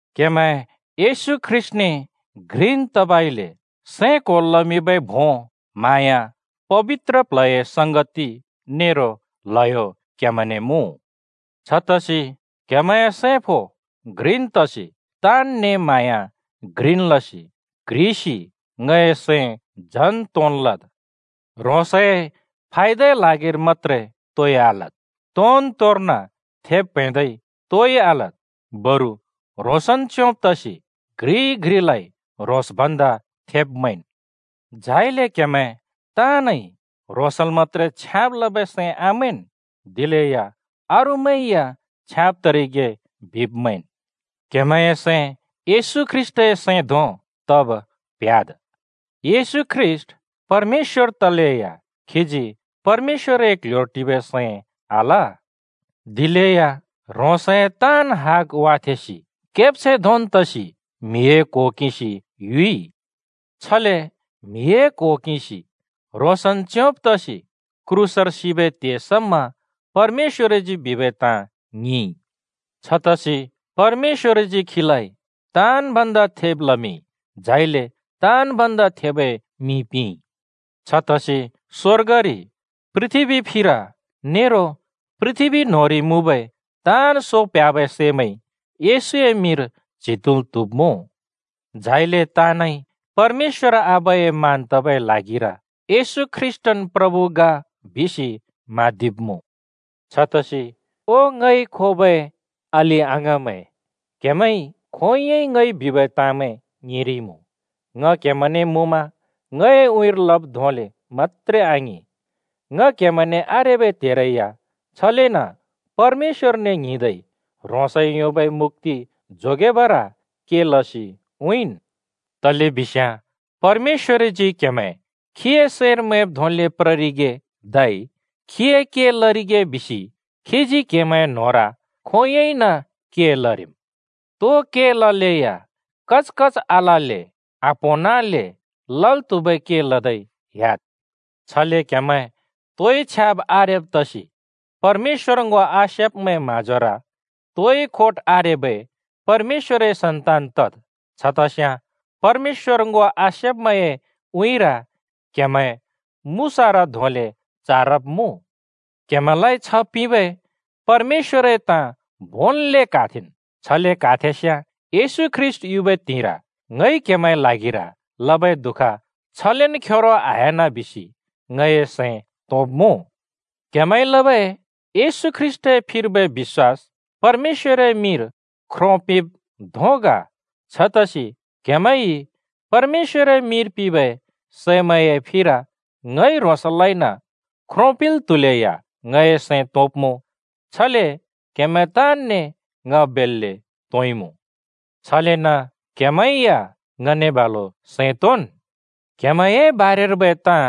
क्हेमैं येशू ख्रीष्‍टने घ्रिन् तबइले सैं क्‍होल् लमिंबै भों, म्हाँया, पबित्र प्ल्हए संगति नेरो ल्हयो क्‍हेमैंने मुँ। छतसि क्‍हेमैंए सैं फो घ्रिन् तसि, ताँनने म्हाँया घ्रिन् लसि, क्‍ह्रिसि ङए सैं झन् तोंन् लद्। ह्रोंसए फायदाए ल्हागिर मत्‍त्रे तोइ आलद्। तोन् तोर्न थेब प्हैंदै तोइ आलद्, बरु ह्रोंसन् च्‍योंने तसि घ्रिइ घ्रिलाइ ह्रोंस भन्दा थेब् मैंन्। झाइले क्हेमैं ताँनइ ह्रोंसल् मत्‍त्रे छ्याँब लबै सैं आमैंन्, दिलेया अरूमैं या छ्याँब तरिगे बिब् मैंन्। क्हेमैंए सैं येशू ख्रीष्‍टए सैं धों तब प्ह्‍याद्। येशू ख्रीष्‍ट परमेश्‍वर तलेया खीजी परमेश्‍वरए क्ल्ह्‍योर टिबै सैं आल। दिलेया ह्रोंसए हग ताँन् वाथेंसि केब्छैं धोंन् तसि म्हिए क्हो किंसि युइ। छले म्‍हिए क्‍हो किंसि, ह्रोंसन् च्‍योंब तसि क्रूसर सिबै त्हे समा परमेश्‍वरजी बिबै ताँ ङिंइ। छतसि परमेश्‍वरजी खीलाइ ताँन् भन्दा थेब लमिंइ, झाइले ताँन् भन्दा थेबै मिं पिंइ। छतसि स्वर्गरि, पृथ्‍बी फिर नेरो पृथ्‍बी न्होंरि मुँबै ताँन् सो प्ह्‍याबै सैमैंइ येशूए मिंर च्हि तुँल् त्हुब्मुँ। झाइले ताँनइ परमेश्‍वर आबाए मान तबै ल्हागिर “येशू ख्रीष्‍टन् प्रभु ग” बिसि म्हाँदिब्मुँ। छतसि, ओ ङइ खोबै अलि-अङाँमैं, क्हेमैंइ खोंयोंइ ङइ बिबै ताँमैं ङिंरिइमुँ। ङ क्‍हेमैंने मुँमा ङए उँइँर लब् धोंले मत्‍त्रे आङिं, ङ क्हेमैंने आरेबै त्हेरै या छलेन परमेश्‍वरने ङ्हिंदै ह्रोंसइ योंबै मुक्‍ति जोगेबर के लसि उँइँन्। तलेबिस्याँ परमेश्‍वरजी क्‍हेमैं खीए सैंर मैंब् धोंले प्ररिगे धै खीए के लरिगे बिसि खीजी क्हेमैंए न्‍होंर खोंयोंइन के लरिम्। तो के ललेया कचकच आलल्‍ले आप्‍होंनले लल् त्हुबै के लदै ह्‍याद्। छले क्‍हेमैं तोइ छ्याब् आरेब तसि परमेश्‍वर ङो आसेब्मैंए म्हाँजोर तोइ खोट आरेबै परमेश्‍वरए सन्तान तद्। छतस्याँ परमेश्‍वर ङो आसेब्मैंए उँइँर क्‍हेमैं मुसारा धोंले चारब्मुँ। क्‍हेमैंलाइ छ्ह पिंबै परमेश्‍वरए ताँ भोंन्ले क्हाथेंन्। छले क्हाथेंस्याँ येशू ख्रीष्‍ट युबै त्हिंइर ङइ क्हेमैंए ल्हागिर लबै दुःख छलेन् खेरो आह्‍याना बिसि ङए सैं तोंब्मुँ। क्‍हेमैंइ लबै येशू ख्रीष्‍टए फिर्बै बिश्‍वास परमेश्‍वरए मिंर ख्रो पिंब् धों ग। छतसि क्हेमैंइ परमेश्‍वरए मिंर पिंबै सैमैंए फिर ङइ ह्रोंसलाइन् ख्रो पिंल् त्हुलेया, ङए सैं तोंब्मुँ। छले क्हेमैं ताँनने ङ बेल्‍ले तोंइमुँ। छलेन क्‍हेमैं या ङने बालुन् सैं तोंन्। क्‍हेमैंए बारेर्बै ताँ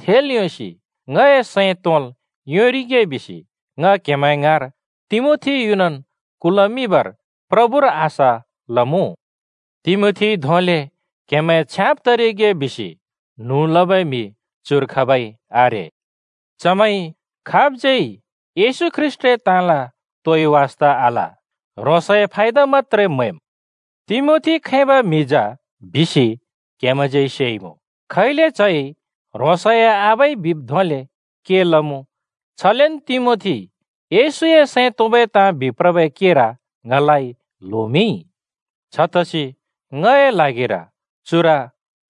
थेल् योंसि ङए सैं तोंल् योंरिगे बिसि ङ क्‍हेमैं ङाँर तिमोथी युनन् कुल्मिंबर प्रभुर आशा लमुँ। तिमोथीइ धोंले क्हेमैं छ्याँब तरिगे बिसि न्हुँ लबै म्‍हि चुर खाबै आरे। (चमैंइ खाबज्यै येशू ख्रीष्‍टए ताँला तोइ वास्‍ता आल, ह्रोंसए फायदा मत्‍त्रे म्हैम्।) तिमोथी खैबै म्हि जा बिसि क्‍हेमैंज्यै सेइमुँ। खैले च्हइ ह्रोंसए आबाइ बिब् धोंले के लमुँ, छलेन तिमोथीइ येशूए सैं तोंबै ताँ बिप्रबै केर ङलाइ ल्होमिंइ। छतसि ङए ल्हागिर चुर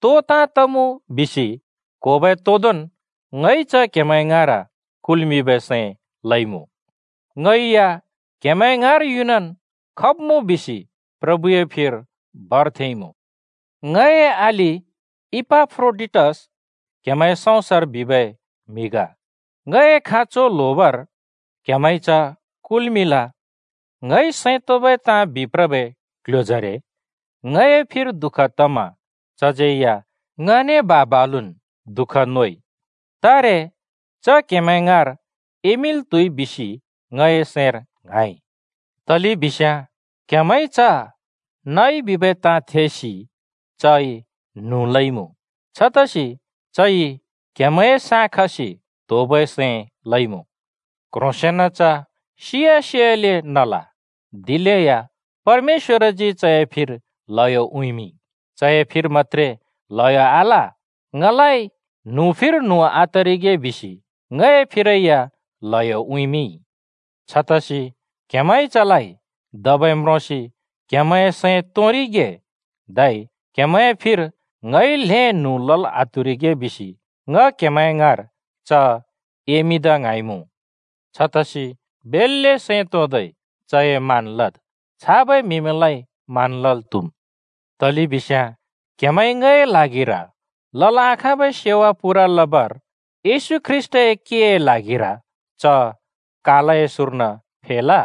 तो ताँ तमुँ बिसि क्होबै तोंदोंन् ङइ च क्‍हेमैं ङाँर कुल्‍मिंबै सैं लइमुँ। ङैया क्‍हेमैं ङाँर युनन् खब्मुँ बिसि प्रभुए फिर भर थेंइमुँ। ङए अलि इपाफ्रोडिटस क्हेमैंए सउँसर बिबै म्‍हि ग, ङए खाँचो ल्होबर क्‍हेमैंइ च कुल्मिंल। ङइ सैं तोंबै ताँ बिप्रबै क्ल्ह्‍योजरे ङए फिर दु:ख तमा चज्यै या ङने बा-बालुन् द:ख नोइ। तारे च क्‍हेमैं ङाँर एमिंल् त्हुइ बिसि ङए सैंर ङ्हाँइ, तलेबिस्याँ क्‍हेमैंइ च नइ बिबै ताँ थेसि चइ न्हुँ लइमुँ। छतसि चइ क्‍हेमैंए साँ खसि त्होबै सैं लइमुँ। क्‍ह्रोंसेन च सिया सियाले नल। दिलेया परमेश्‍वरजी चए फिर ल्हयो उँइँमिंइ। चए फिर मत्‍त्रे ल्हयो आल, ङलाइ न्हुँ फिर न्हुँ आतरिगे बिसि ङए फिरै या ल्हयो उँइँमिंइ। छतसि क्‍हेमैंइ चलाइ धबै म्रोंसि क्‍हेमैंए सैं तोंरिगे, धै क्हेमैंए फिर ङइ ल्हें न्हुँ लल् आत्हुरिगे बिसि ङ क्‍हेमैं ङाँर च एमिंदा ङ्हाँइमुँ। छतसि बेल्‍ले सैं तोंदै चए मान लद्। छाबै म्‍हिमैंलाइ मान लल् त्हुम्। तलेबिस्याँ क्हेमैंइ ङए ल्हागिर लल् आखाँबै सेवा पूरा लबर येशू ख्रीष्‍टए केए ल्हागिर च कालए सुँर्न फेल।